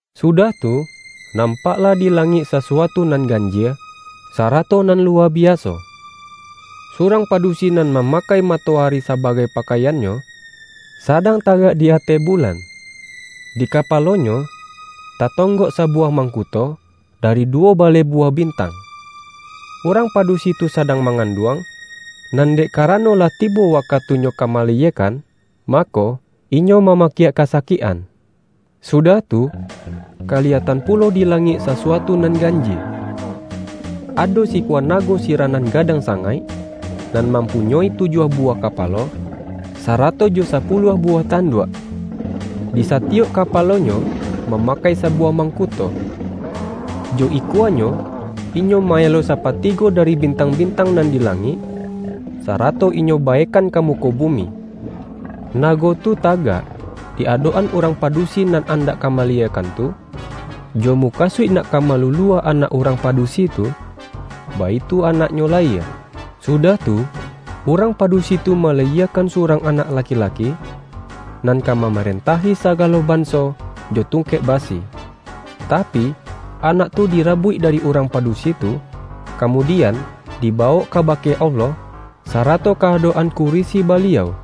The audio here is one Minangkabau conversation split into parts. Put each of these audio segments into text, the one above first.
Sudah tu, nampaklah di la-ngik sasuatu nan ganjie, sa-rato nan luwa biaso. Surang padusi nan mamakai matoari sabagai pakai-annyo, sadang tagak di ateh bulan. Di kapalonyo, tatonggok sabuwah mangkuto, dari duwo baleh buwah bintang. Urang padusi tu sadang manganduang, nan dek karano lah ti-bo wakatunyo ka malayiekan, mako, inyo mamakiak kasakik-an. Sudah tu, kaliyatan pulo di langik sasuatu nan ganjie. Ado sikua nago sirah nan gadang sangaik, nan mam-punyoi tujuah buwah kapalo, sarato jo sapuluah buwah tanduak. Di sa-tiyok kapalonyo, mamakai sabuwah mangkuto. Jo ikuanyo, inyo ma-elo sapatigo dari bintang-bintang nan di langik, sarato inyo baekan ka mu-ko bumi. Nago tu tagak di adok-an urang padusi nan andak ka malayie-kan tu, jo mukasuik nak ka malulua anak urang padusi tu, baitu anaknyo layie. Sudah tu, urang padusi tu ma-layiekan surang anak laki-laki, nan ka mamarentahi sagalo banso jo tung-kek basi. Tapi, anak tu dirabuik dari urang padusi tu, kamudian, dibawok kabake Allah, sarato ka-adok-an kuri-si Baliau.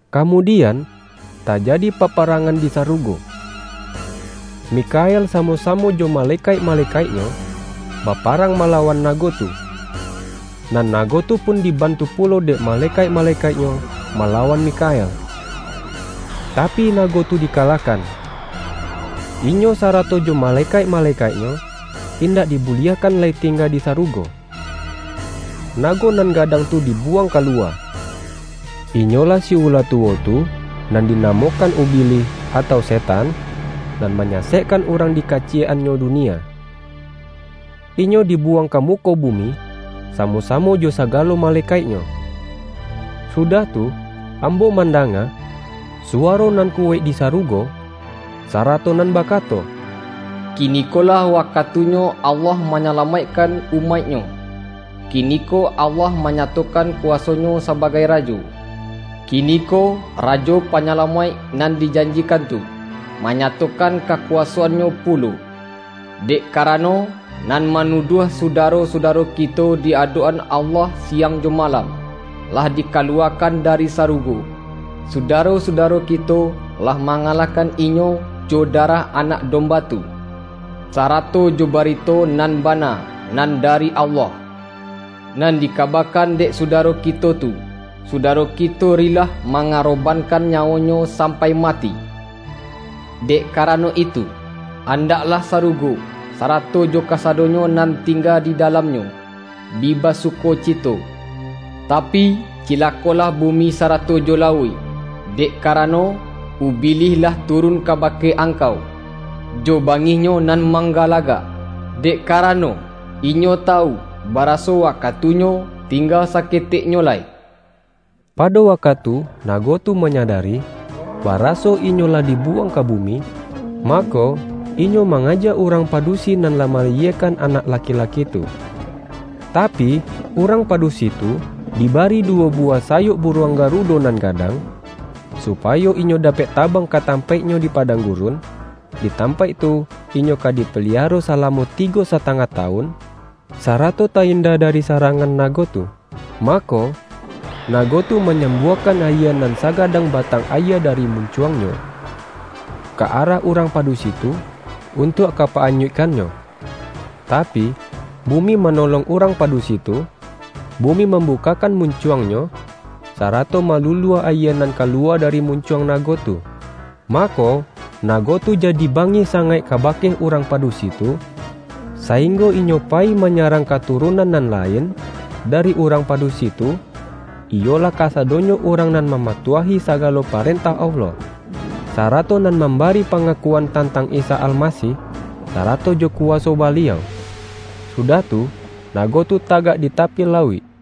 Kamudian, tajadi paparangan di sarugo. Mikhael samo-samo jo ma-lekaik-malekaiknyo, baparang mala-wan nago tu. Nan nago tu pun, diban-tu pulo dek malekaik-malekaiknyo malawan Mikhael. Tapi, nago tu di-kalahkan. Inyo sarato jo malekaik-malekaiknyo, indak dibuliahkan lai tingga di sarugo. Nago nan gadang tu dibuwang ka luwa! Inyolah si ula tuwo tu, nan dinamokan Ubilih, atau setan, nan manyasekkan urang di ka-ciyek-annyo dunia. Inyo dibuwang ka muko bumi samo-samo jo sagalo ma-lekaiknyo. Sudah tu, ambo mandanga suwa-ro nan kuwaik di sarugo, sarato nan bakato,”Kinikolah wakatunyo Allah manyalamaikkan umaik-Nyo! Kini-ko Allah manyatokan kuwaso-Nyo sabagai Rajo! Kiniko, Rajo Panyala-maik nan dijanjikan tu, manyatokan kakuwasoan-Nyo pulo! Dek karano, nan manuduah sudaro-sudaro kito di adok-an Allah siang jo malam, lah di-kaluwakan dari sarugo. Sudaro-sudaro kito, lah mangalahkan inyo jo darah Anak Domba tu, sarato jo bari-to nan bana nan dari Allah, nan dika-bakan dek sudaro kito tu. Sudaro kito rilah mangarobankan nyawonyo sam-pai mati. Dek karano itu, andaklah sarugo, sarato jo kasadonyo nan ting-ga di dalamnyo, bi basukocito! Tapi, cilakolah bumi sarato jo lauik, dek ka-rano, Ubilih lah turun kabake angkau, jo bangihnyo nan manggalagak, dek karano, inyo tawu baraso wakatunyo tingga saketek nyo lai.” pado wakatu nago tu manyada-ri, baraso inyo lah dibuwang ka bu-mi, mako, inyo mangaja urang padu-si nan lah malayiekan anak laki-laki tu. Tapi, urang padusi tu dibari du-wo buwah sayok buruang garudo nan gadang, supayo inyo dapek tabang ka tampaiknyo di padang gurun, di tam-paik tu inyo ka dipaliaro salamo ti-go satangah tawun, sarato ta-inda dari sarangan nago tu. Mako, na-go tu manyambuakan ayie nan saga-dang batang ayie dari muncuangnyo, ka arah urang padusi tu, untuak ka pa-anyuikkannyo. Tapi, bumi ma-nolong urang padusi tu; bumi mam-bukakkan muncuangnyo, sarato ma-lulua ayie nan kaluwa dari muncuang nago tu. Mako, nago tu jadi bangih sangaik kabake urang padusi tu, sa-inggo inyo payi manyarang katu-runan nan lain dari urang padusi tu, iyolah kasadonyo urang nan mama-tuahi sagalo parentah Allah, sarato nan mambari pangakuan tantang Isa Almasih, sarato jo kuwaso Baliau. Sudah tu, nago tu tagak di tapi lauik.